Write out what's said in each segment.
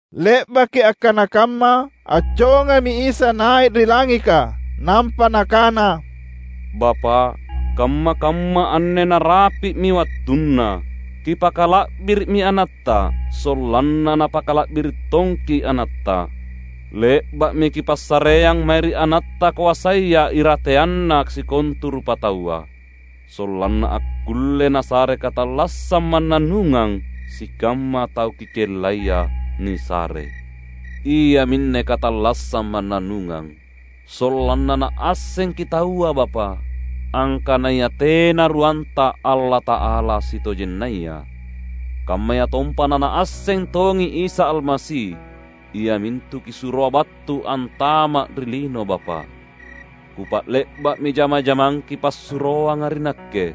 Le’baki akkana kamma, accongami Isa nai’ ri langika nampa Nakana, "Bapa’, kamma-kamma anne narapi’mi wattunna. Kipakala’biri’mi AnatTa, sollanna Napakala’biri’ tongKi’ AnatTa. Le’ba’mi Kipassareang mae ri AnatTa koasaya irateanna sikontu rupataua, sollanna akkulle Nasare katallassang mannannungang sikamma tau Kikellaia nisare. Iaminne katallassang mannannungang; sollanna naassengKi’ taua Bapa’, angkanaya tena ruanTa Allata’ala sitojennaya. Kammayatompa nanaasseng tongi Isa Almasi, iamintu Kisuroa battu antama’ ri lino Bapa’. Kupa’le’ba’mi jama-jamang Kipassuroanga ri Nakke,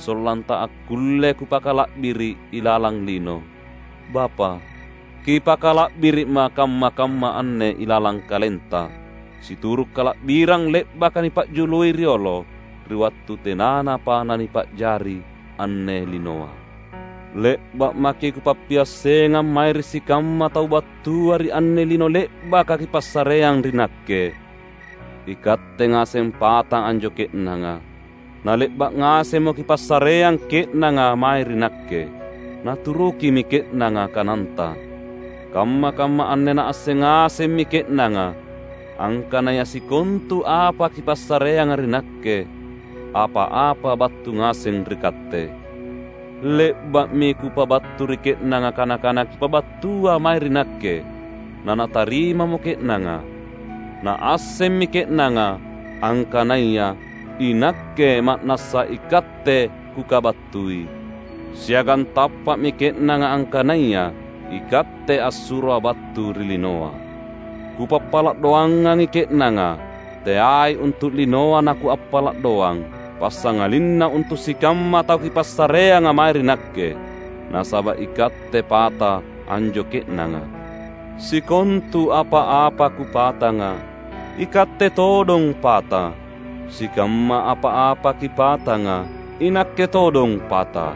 sollanTa akkulle Kupakala’biri’ ilalang lino. Bapa’! Kipakala’biri’Ma’ kamma-kamma anne ilalang KalenTa, situru’ kala’birang le’baka nipa’jului riolo, ri wattu tenanapa nanipa’jari anne linoa. Le’ba’ maKi’ Kupappiassengang mae ri sikamma tau battua ri anne lino le’baka Kipassareang ri Nakke. IKatte ngaseng pata anjo ke’nanga, na le’ba’ ngasemmo Kipassareang ke’nanga mae ri Nakke. Naturukimi ke’nanga kananTa. Kamma-kamma anne naasseng ngasemmi ke’nanga, angkanaya sikontu apa Kipassareanga ri Nakke, apa-apa battu ngaseng ri Katte. Le’ba’mi Kupabattu ri ke’nanga kana-kana Kipabattua mae ri Nakke, nanatarimamo ke’nanga. Naassemmi ke’nanga, angkanaya iNakke ma’nassa iKatte Kukabattui, siagang tappa’mi ke’nanga angkanaya iKatte assuroA’ battu ri linoa. Kupappala’ doangangi ke’nanga. Teai untu’ linoa naKuappala’ doang, passangalinna untu’ sikamma tau Kipassareanga mae ri Nakke, nasaba’ iKatte pata anjo ke’nanga. Sikontu apa-apa Kupatanga, iKatte todong pata; sikamma apa-apa Kipatanga, iNakke todong pata.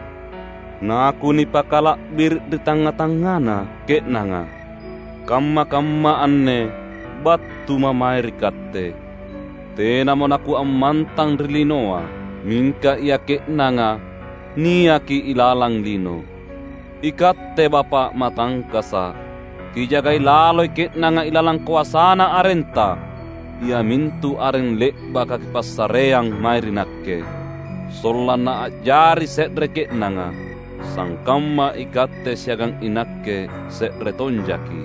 NaKunipakala’biri’ ri tangnga-tangngana ke’nanga. Kamma-kamma anne battuMa’ mae ri Katte. Tenamo naKuammantang ri linoa; mingka ia ke’nanga niaki ilalang lino. IKatte Bapa’ Matangkasa’! Kijagai laloi ke’nanga ilalang koasana arenTa, iamintu areng le’baka Kipassareang mae ri Nakke — sollanna a’jari se’re ke’nanga, sangkamma iKatte siagang iNakke se’re tonjaKi’.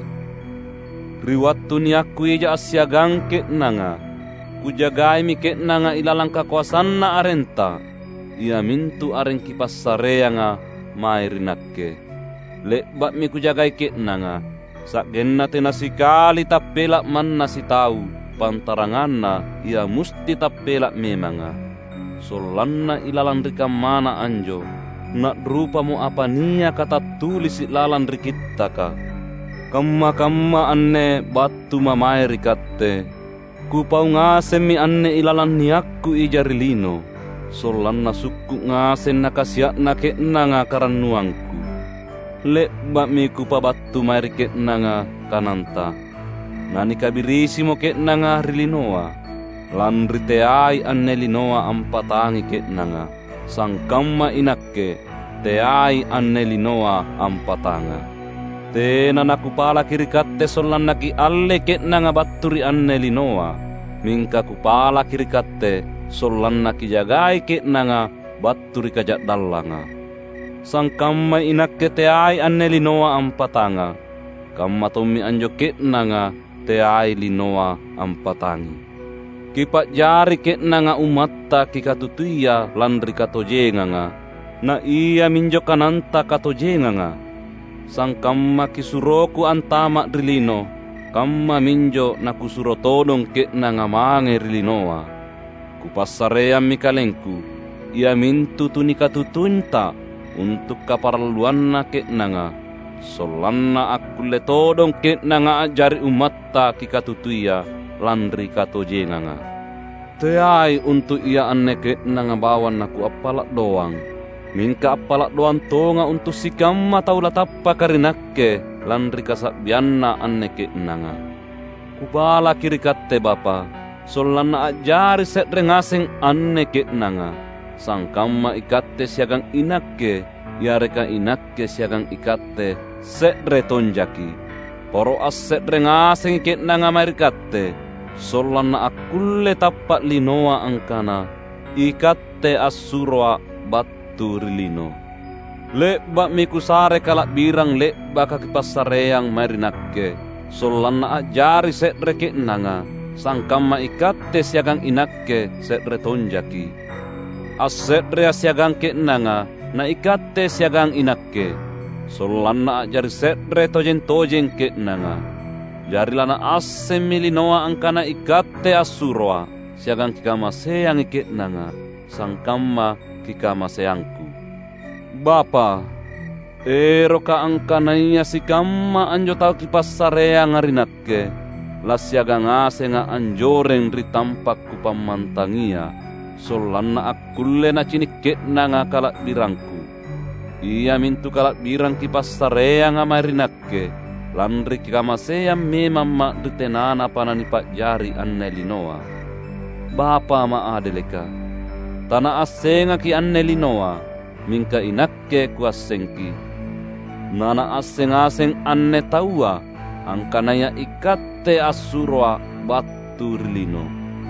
Ri wattu niakKu ija assiagang ke’nanga, Kujagaimi ke’nanga ilalang kakoasanna arenTa — iamintu areng Kipassareanga mae ri Nakke. Le’ba’mi Kujagai ke’nanga, sa’genna tena sikali tappela’ manna sitau, pantaranganna ia musti tappela’ memanga; sollanna ilalang ri kammana anjo na’rupamo apa niaka tattulisi’ lalang ri Kittaka. Kamma-kamma anne battuMa’ mae ri Katte. Kupau ngasemmi anne ilalang niakKu ija ri lino; sollanna sukku’ ngaseng nakasia’na ke’nanga karannuangKu. Le’ba’mi Kupabattu mae ri ke’nanga kananTa; nanikabirisimo ke’nanga ri linoa, lanri teai anne linoa ampatangi ke’nanga, sangkamma iNakke, teai anne linoa ampatangA’. Tena naKupalaki ri Katte sollanna Kiallei ke’nanga battu ri anne linoa, mingka Kupalaki ri Katte sollanna Kijagai ke’nanga battu ri Kaja’dallanga. Sangkammai iNakke teai anne linoa ampatangA’, kammatommi anjo ke’nanga teai linoa ampatangi. Kipa’jari ke’nanga ummatTa Kikatutuia lanri katojenganga; na iaminjo kananTa katojenganga. Sangkamma KisuroKu antama’ ri lino, kammaminjo naKusuro todong ke’nanga mange ri linoa. Kupassareammi KalengKu, iamintu tu nikatutuinTa, untu’ kaparalluanna ke’nanga, sollanna akkulle todong ke’nanga a’jari ummatTa Kikatutuia, lanri katojenganga. Teai untu’ ia anne ke’nanga bawang naKuappala’ doang. Mingka appala’ doang tongA’ untu’ sikamma tau latappaka ri Nakke lanri kasa’bianna anne ke’nanga. Kupalaki ri Katte Bapa’, sollanna a’jari se’re ngaseng anne ke’nanga, sangkamma iKatte siagang iNakke yareka iNakke siagang iKatte se’re tonjaKi’. Poro asse’re ngasengi ke’nanga mae ri Katte, sollanna akkulle tappa’ linoa angkana iKatte assuroA’ battu ri lino. Le’ba’mi Kusare kala’birang le’baka Kipassareang mae ri Nakke, sollanna a’jari se’re ke’nanga, sangkamma iKatte siagang iNakke se’re tonjaKi’; asse’reA’ siagang ke’nanga, na iKatte siagang iNakke, sollanna a’jari se’re tojeng-tojeng ke’nanga. Jari lanaassemmi linoa angkana iKatte assuroA’, siagang Kikamaseangi ke’nanga, sangkamma KikamaseangKu. Bapa’, erokKa’ angkanaya sikamma anjo tau Kipassareanga ri Nakke, lassiagang ngasengA’ anjoreng ri tampa’ Kupammantangia, sollanna akkulle nacini’ ke’nanga kala’birangKu. Iamintu kala’birang Kipassareanga mae ri Nakke, lanri Kikamaseang memamMa’ ri tenanapa nanipa’jari anne linoa. Bapa’ maadeleka! TanaassengaKi’ anne linoa, mingka iNakke KuassengKi’. Na naasseng ngaseng anne taua angkanaya iKatte assuroA’ battu ri lino.